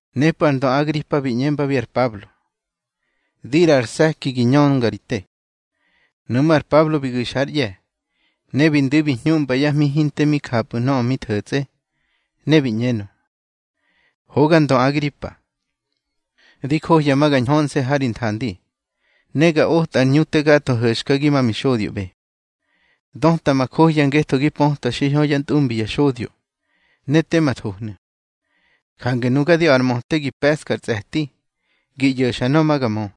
Nepꞌu̱ ar ndö Agripa bi ꞌñembabi ar Pablo: —Di ꞌraꞌa ar se̱ki gi ñönga ri te. Nuꞌmú̱ ar Pablo bi gu̱xa ár ꞌye̱, ne bi ndu̱i bi ñhuꞌmba yá hmi hinte mi njapꞌu̱ nöꞌö bi tho̱tsꞌe, bi ꞌñenö: —Hoga ndö Agripa, di johya ma ga ñhönse̱ ha ri nthandi, ne ga otꞌar ꞌñu te gatho ho̱xkagi ma mixodyoꞌbe. Döta ma johya ngetho gi pötwa xiñho yá ntꞌumbi ya xodyo, ne tema thohnu̱. Jange nuga di a̱ꞌar möte gi pe̱ꞌska ar tsꞌe̱ti gi ꞌyo̱xa nöꞌö ma ga mö.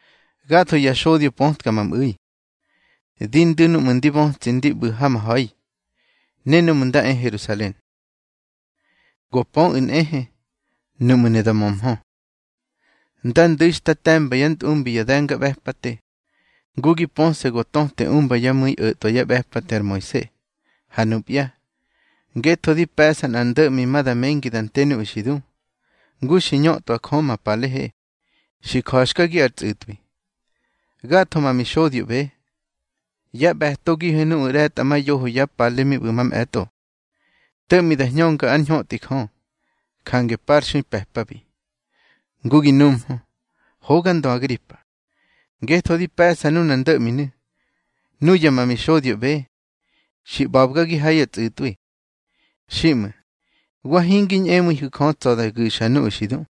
Gatho ya xodyo pötka ma mꞌu̱i, di ndu̱ núꞌmu̱ ndi bötsi ndi ꞌbu̱ ha ma ha̱i, ne núꞌmu̱ nda e Herusalen. Go pöꞌu̱ nꞌehe, nuꞌmu̱ ne da mömhö, nda ndu̱i xta te̱mba yá ntꞌumbi ya de̱ngaꞌbe̱pate. Ngu gi pöse̱ go töte umba yá mu̱i o̱tꞌwa yá ꞌbe̱pate ar Moise. Ha nupya, ngetho di pe̱ꞌsa nꞌa ndo̱ꞌmi ma da mengi da nte nuꞌu̱ xi du, ngu xi ñötꞌwa Jö ma palehe, xi ja̱xkagi ar tsꞌu̱tꞌwi. Gatho ma mixodyoꞌbe, yá ꞌbe̱togihe nuꞌu̱ ꞌre̱tꞌamayoho ya pale mi ꞌbu̱ mamꞌe̱tꞌo, to̱ꞌmi da hñönga ár ñhötꞌi Jö, jange parxui pe̱pabi. Ngu gi numhö, hoga ndö Agripa, ngetho di pe̱ꞌsa nunar ndo̱ꞌminu̱, nuya ma mixodyoꞌbe xi ꞌba̱bgagi ha ya tsꞌu̱tꞌwi. Xiꞌmu̱, wa hingi ñꞌemu̱ihu̱, Jö tsa̱ da gu̱xa nuꞌu̱ xi du.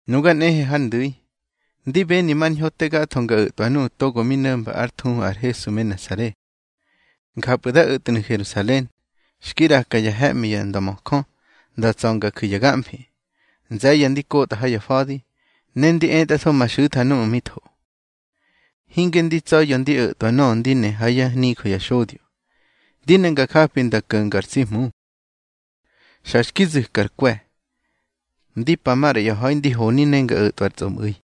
Nuga nꞌehe har ndu̱i, ndi beni mar ñho te gatho nga o̱tꞌwa nuꞌu̱ togo mi no̱mba ár thuhu ar Hesu me Nasare. Njapꞌu̱ da o̱tnu̱ Herusalen. Xki ꞌraka ya he̱ꞌmi ya ndömöjö nda tsa̱ nga ju̱ ya gamfi. Nze̱ye̱ ndi kotꞌa ha ya fa̱di, ne ndi etꞌatho ma xu̱tha núꞌmu̱ mi tho. Hinge ndi tsa̱ya̱ ndi o̱tꞌwa nöꞌö ndi ne ha yá nijö ya xodyo, ndi ne nga japi nda ko̱nga ar tsi Hmu. Xa xki zu̱kar kwe̱, ndi pa maꞌra ya ha̱i ndi honi ne nga o̱tꞌwa ar tsꞌomꞌu̱i.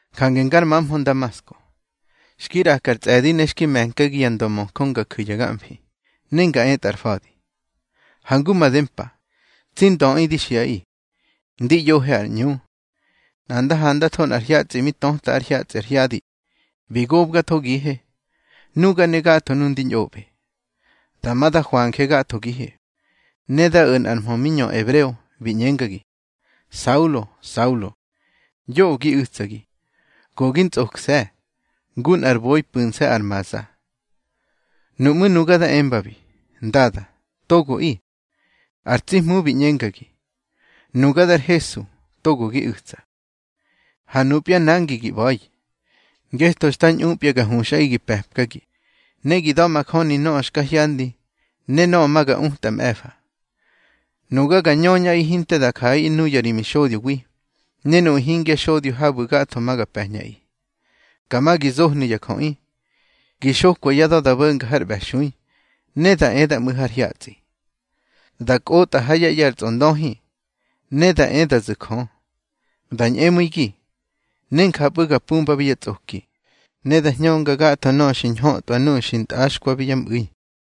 Jange ngar mamhö Ndamasko, xki ꞌraka ar tsꞌe̱di ne xki me̱nkagi ya ndömöjö nga ju̱ ya gamfi, nga etꞌa ar fa̱di. Ha ngu made mpa, tsi ndöꞌi di xiꞌaꞌi, ndi ꞌyohe ar ꞌñu, nꞌa nda handatho nꞌar hyatsꞌi mi töta ár hyatsꞌi ar hyadi, bi gobgathogihe, nuga ne gatho nuꞌu̱ ndi ñꞌoꞌbe. Dama da hwanje gathogihe, ne dá o̱ nꞌar mhö mi ñö ebreo, bi ꞌñengagi: Saulo, Saulo, yoꞌö gi u̱tsagi. Go gi ntsꞌokse̱, ngu nꞌar boi pu̱nse̱ ar maza. Nuꞌmú̱ nuga da embabi: Ndada, togoꞌi. Har tsi Hmu bi ꞌñengagi: Nuga dar Hesu, togo gi u̱tsa. Ha nupya nangi gi ꞌba̱i, ngetho xta ñꞌupya ga huxꞌaꞌi gi pe̱pkagi, ne gi da̱majöni nöꞌö xka hyandi ne nöꞌö ma ga utꞌa mꞌe̱fa. Nuga ga ñöñꞌaꞌi hinte da jaꞌaꞌi nuyu̱ ri mixodyowi, ne nuꞌu̱ hingya xodyo habu̱ gatho ma ga pe̱ñꞌaꞌi. Ka ma gi zohnu̱ ya jöꞌi, gi xokwa yá da̱ da bo̱nga har ꞌbe̱xui, ne da e da mꞌu̱ har hyatsꞌi. Da kꞌotꞌa ha yá ꞌye̱ ar tsꞌondöhi, ne da e da zu̱ Jö. Da ñꞌemu̱igi, ne njapꞌu̱ ga pumbabi yá tsꞌoki, ne da hñönga gatho nöꞌö xa ñhötꞌwa nuꞌu̱ xi ntꞌaxkwabi yá mꞌu̱i.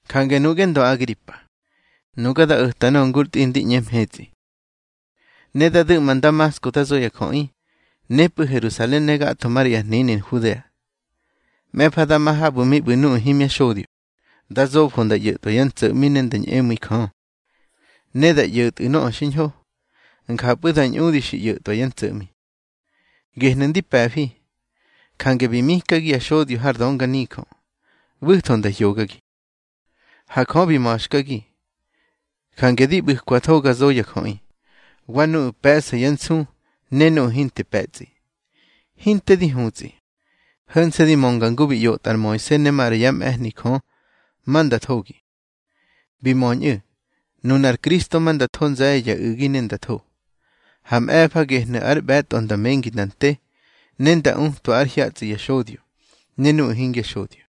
Jange, nuꞌge ndö Agripa, nuga da o̱ta nöꞌö ngur tꞌi ndi ꞌñe mhetsꞌi. Ne da du̱ꞌma Ndamasko da zo ya jöꞌi, nepꞌu̱ Herusalen ne gatho maꞌra ya hnini Nhudea. Mꞌe̱fa da ma habu̱ mi ꞌbu̱ nuꞌu̱ hingya xodyo, da zofo nda ꞌyo̱tꞌwa yá ntso̱ꞌmi ne da ñꞌemu̱i Jö. Ne da ꞌyo̱tꞌu̱ nöꞌö xiñho, njapꞌu̱ da ñꞌudi xi ꞌyo̱tꞌwa yá ntso̱ꞌmi. Gehnu̱ ndi pe̱fi, jange bi mikagi ya xodyo har dönganijö, ꞌbu̱tho nda hyogagi. Ha Jö bi ma̱xkagi, jange di ꞌbu̱kwatho ga zo ya jöꞌi, wa nuꞌu̱ pe̱ꞌsa yá nsu ne nuꞌu̱ hinte pe̱tsꞌi. Hinte di hutsꞌi, ho̱nse̱ di mönga ngu bi ꞌyotꞌa ar Moise ne maꞌra yá mꞌe̱hni Jö ma nda thogi. Bi möñꞌu̱, nunar Kristo ma nda tho nze̱ye̱ ya u̱gi ne nda tho. Ha mꞌe̱fa gehnu̱ ar ꞌbe̱tꞌo nda mengi nda nte, ne nda utwa ar hyatsꞌi ya xodyo ne nuꞌu̱ hingya xodyo.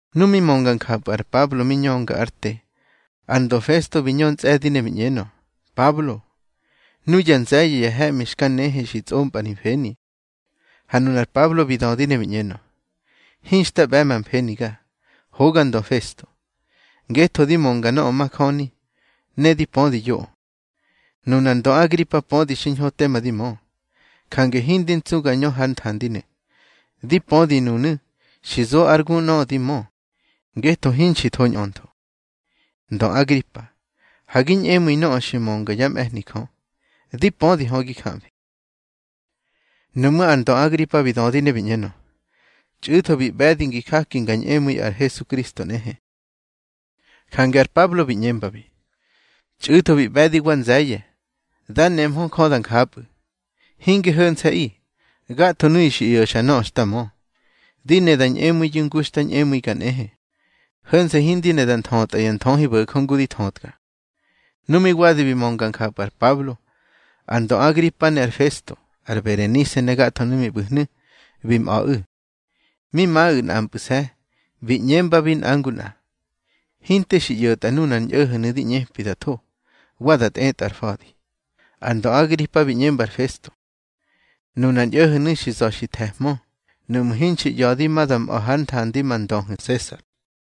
Nu mi mönga njapꞌu̱ ar Pablo mi ñönga ár te, ar ndö Festo bi ñö ntsꞌe̱di ne bi ꞌñenö: —Pablo, nuya nze̱ye̱ ya he̱ꞌmi xka nehe xi tsꞌompꞌa ri mfeni. Ha nunar Pablo bi dödi ne bi ꞌñenö: —Hinxta ꞌbe̱ ma mfeniga, hoga ndö Festo, ngetho di mönga nöꞌö majöni, ne di pödi yoꞌö. Nunar ndö Agripa pödi xiñho tema di mö, jange hindi ntsu ga ñö hár nthandinu̱. Di pödi nunu̱, xi zo ár gu nöꞌö di mö, ngetho hinxi tho ñꞌöntho. Ndö Agripa, ha gi ñꞌemu̱i nöꞌö xi mönga yá mꞌe̱hni Jö. Di pödi hö, gi jamfi. Nuꞌmú̱ ar ndö Agripa bi dödi ne bi ꞌñenö: —Txꞌu̱tho bi ꞌbe̱di ngi jaki nga ñꞌemu̱i ar Hesukristo nꞌehe. Jange ar Pablo bi ꞌñembabi: —Txꞌu̱tho bi ꞌbe̱di wa nze̱ye̱, dá nemhö Jö da njapꞌu̱. Hinge ho̱nse̱ꞌi, gatho nuyu̱ xi ꞌyo̱xa nöꞌö xta mö, di ne da ñꞌemu̱iyu̱ ngu xta ñꞌemu̱iga nꞌehe. Ho̱nse̱ hindi ne da nthötꞌa ya nthöhibo̱jö ngu di thötka. Nu mi wadi bi mönga njapꞌu̱ ar Pablo, ar ndö Agripa ne ar Festo, ar Berenise ne gatho nuꞌu̱ mi ꞌbu̱hnu̱, bi mꞌa̱ꞌu̱. Mi maꞌu̱ nꞌampꞌu̱se̱, bi ꞌñembabi nꞌa ngu nꞌa: —Hinte xi ꞌyo̱tꞌa nunar ñꞌo̱ho̱nu̱ di ꞌñepi da tho, wa da tꞌetꞌar fa̱di. Ar ndö Agripa bi ꞌñemba ar Festo: —Nunar ñꞌo̱ho̱nu̱ xi za̱ xi the̱hmö nuꞌmu̱ hinxi ꞌya̱di ma da mꞌa̱ hár nthandi ma ndöhu̱ Sesar.